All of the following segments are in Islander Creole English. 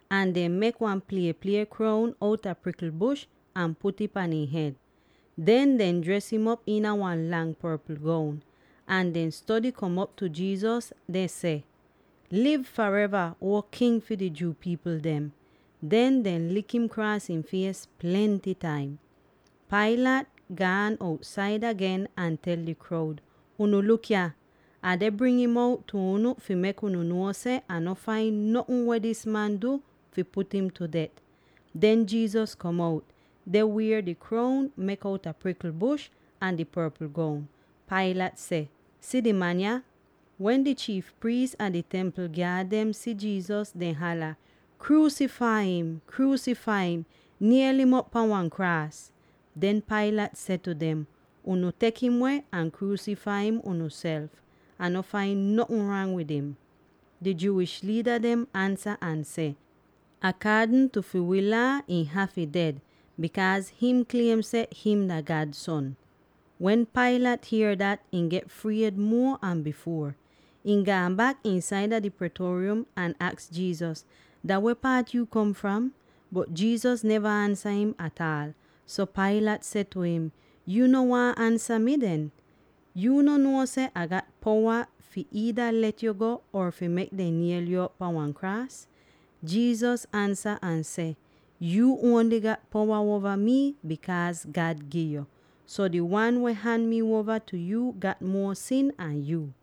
ahn dehn mek wan plie-plie kroun outa prikl bush ahn put'ih pahn ihn hed. Den dehn dres im op iina wan lang porpl goun; ahn dehn stody kom op tu Jesus deh seh, “Liv fareva, Uo King fi di Jew pipl dem!” Den dehn lik'im kraas ihn fies plenty taim! Pilate gaan outsaid agen ahn tel di kroud, “Unu luk yah; Ah deh bring im out tu unu fi mek unu nuo seh Ah no fain notn weh dis man du fi put im tu det.” Den Jesus kom out, deh wier di kroun mek outa prikl bush ahn di porpl goun. Pilate seh, “Si di man yah!” Wen di chiif priis ahn di Templ gyaad dem si Jesus, dehn hala, “Kruusifai im! Kruusifai im! Niel'im op pan wan kraas!” Den Pilate seh tu dem, “Unu tek im weh ahn kruusifai im unuself; Ah no fain notn rang wid im.” Di Jewish liida dem ansa ahn seh, “Akaadn tu fi wii Laa, ihn hafy ded, bikaaz him kliem seh him dah God Son!” Wen Pilate hier dat, ihn get muo fried an bifuor. Ihn gaan bak iinsaida di Praetorium ahn aks Jesus, “Dah weh paat yuu kom fram?” Bot Jesus neva ansa im ataal. So Pilate seh tu im, “Yu no waahn ansa mi den? Yu no nuo seh Ah gat powa fi iida le'go yo, or fi mek dem niel yo op pahn wan kraas?” Jesus ansa seh, “Yu ongl gat powa uova mii, bikaaz God gi'yo. So di wan weh han mi uova tu yu gat muo sin an yu.”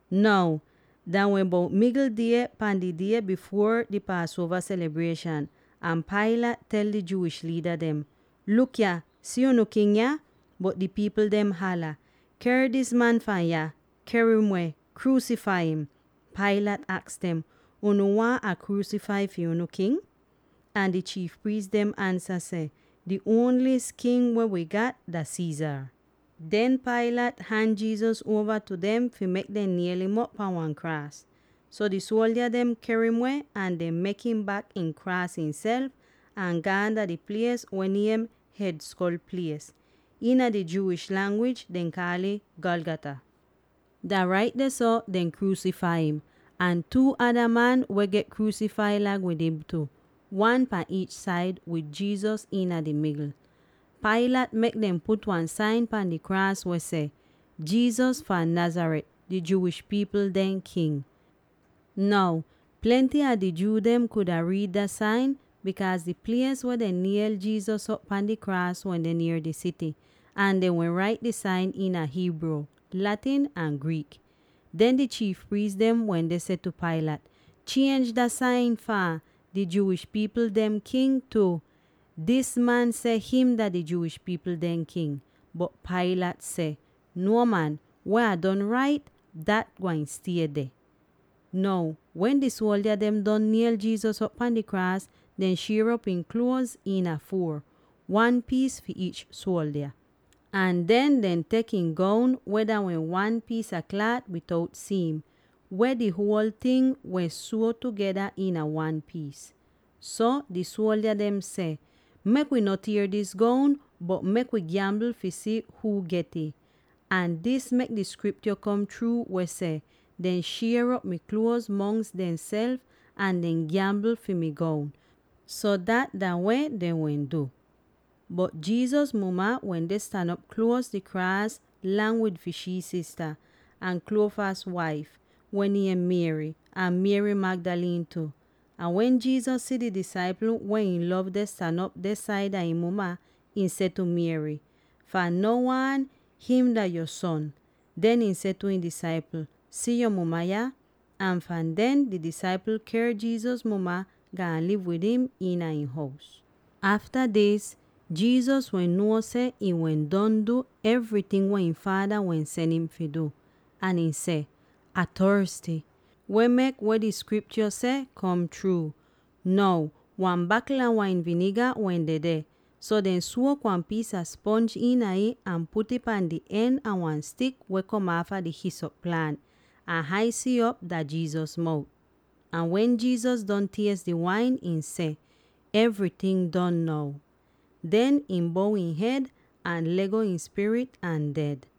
Now, dah wehn bout migl die pahn di die bifuor di Paasuova selibrieshan, ahn Pilate tel di Jewish liida dem, “Luk yah! Si, fi unu King yah!” Bot di pipl dem hala, “Ker dis man fahn yah! Ker im weh! Kruusifai im!” Pilate aks dem, “Unu waahn Ah kruusifai fi unu King?” Ahn di chiif priis dem ansa seh, “Di ongli'is king weh wii gat dah Caesar!” Den Pilate han Jesus uova tu dem fi mek dem niel'im op pahn wan kraas. So di suoldya dem ker im weh, ahn dehn mek im bak ihn kraas ihnself, ahn gaan dah di plies weh niem “Hed Skol Plies.” Iina di Jewish langwij dehn kaal'ih “Golgotha.” Dah rait dehso dehn kruusifai im. Ahn two ada man wehn get kruusifai lang wid im tu —one pahn iich said, wid Jesus iina di migl. Pilate mek dem put wan sain pahn di kraas weh seh, “Jesus fahn Nazareth, di Jewish pipl dehn King.” Now plenty a di Jew dem kuda riid dah sain, bikaaz di plies weh dehn niel'op Jesus pahn di kraas wende nier di sity, ahn dehn wehn rait di sain iina Hebrew, Latin ahn Greek. Den di chiif priis dem wende seh tu Pilate, “Chienj dah sain fahn: ‘Di Jewish pipl dehn King,’ tu: ‘Dis man seh him dah di Jewish pipl dehn King.’” Bot Pilate seh, “Nuo man; weh Ah don rait, dat gwain stie deh!” Now wen di suoldya dem don niel'op Jesus pahn di kraas, dehn shier op ihn kluoz iina four —wan piis fi iich suoldya. Ahn den dehn tek ihn goun, weh dah wehn wan piis a klaat bitout siim, weh di huol ting wehn suo tugeda iina wan piis. So, di suoldya dem seh, “Mek wi no tier dis goun, bot mek wi gyambl fi si huu get'ih.” Ahn dis mek di Skriptyo kom chruu weh seh, “Dehn shier op mi kluoz mongs dehnself ahn dehn gyambl fi mi goun.” So dat dah weh dehn du. Bot Jesus muma wende stan op nier tu di kraas lang wid fi shii sista, ahn Clopas waif, weh niem Mary, ahn Mary Magdalene tu. Ahn wen Jesus si di disaipl weh ihn lov deh stan op deh saida ihn muma, ihn seh tu Mary, “Fahn now aan him dah yo son.” Den ihn seh tu ihn disaipl, “Si yo muma yah.” Ahn fahn den di disaipl ker Jesus muma, gaan liv wid im iina ihn hous. Afta dis, Jesus wehn nuo seh ihn wehn don du evryting weh ihn Faada wehn sen im fi du; ahn ihn seh, “Ah torsty,” weh mek weh di Skriptyo seh kom chruu. Now, wan bakl a wain viniga wehn dedeh, so dehn suok wan piis a sponj iina ih ahn put'ih pahn di en a wan stik weh kom aafa di hisop plaant ahn hais ih op dah Jesus mout. Ahn wen Jesus don ties di wain, ihn seh, “Evryting don now!” Den ihn bow ihn hed, ahn le'go ihn spirit ahn ded.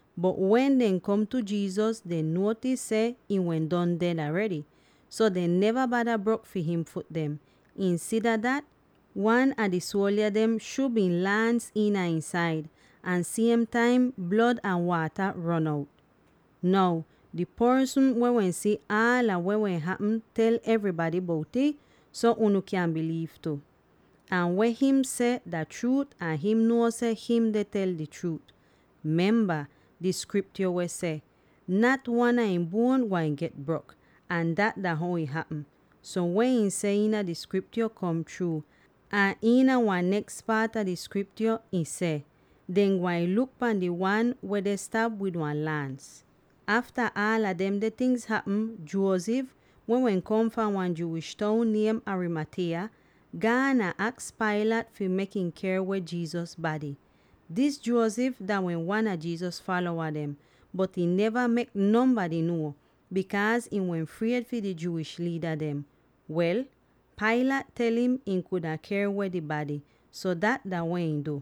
Bot wen dehn kom tu Jesus, dehn nuotis seh ihn wehn don ded aredy, so dehn neva bada brok fi him fut dem. Insida dat, wan a di suoldya dem shub ihn laans iina ihn said, ahn siem taim blod ahn waata ron out. Now, di porsn weh wehn si aala weh wehn hapm tel evrybady bout'ih so unu kyan biliiv tu. Ahn weh him seh dah chruut ahn him nuo seh him deh tel di chruut. Memba, di Skriptyo weh seh, “Nat wan a ihn buon gwain get brok.” Ahn dat dah how ih hapm, so weh ih seh iina di Skriptyo kom chruu. Ahn iina wan neks paat a di Skriptyo ih seh, “Dehn gwain luk pahn di Wan weh dehn stab wid wan laans.” Afta aala demde tingz hapm, Joseph, weh wehn kom fahn wan Jewish toun niem Arimathea, gaan ahn aks Pilate fi mek ihn ker weh Jesus bady. Dis Joseph dah wehn wan a Jesus falowa dem, bot ihn neva mek nonbady nuo, bikaaz ihn wehn fried fi di Jewish liida dem. Wel, Pilate tel im ihn kuda ker weh di bady, so dat dah weh ihn du.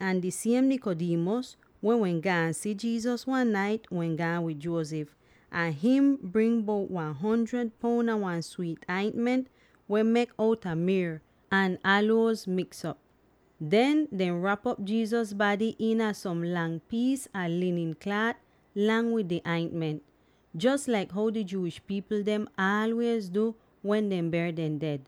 Ahn di siem Nicodemus, weh wehn gaan si Jesus wan nait, wehn gaan wid Joseph, ahn him bring bout wan hundred poun a wan swiit aintment weh mek outa mor ahn aluoz miks'op. Den dehn rap op Jesus bady iina som lang piis a linin klaat lang wid di aintment, jos laik how di Jewish pipl dem aalwiez du wen dehn ber dehn ded.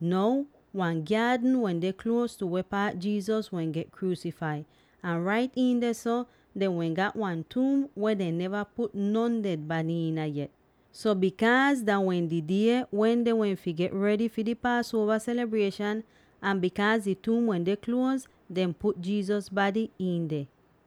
Now wan gyaadn wende nier tu weh paat Jesus wehn get kruusifai, ahn rait iin dehso dehn wehn gat wan tuum weh dehn neva put non ded bady iina yet. So bikaaz dah wehn di die wen dehn wehn fi get redy fi di Paasuova selibrieshan, ahn bikaaz di tuum wende kluos, dehn put Jesus bady iin deh.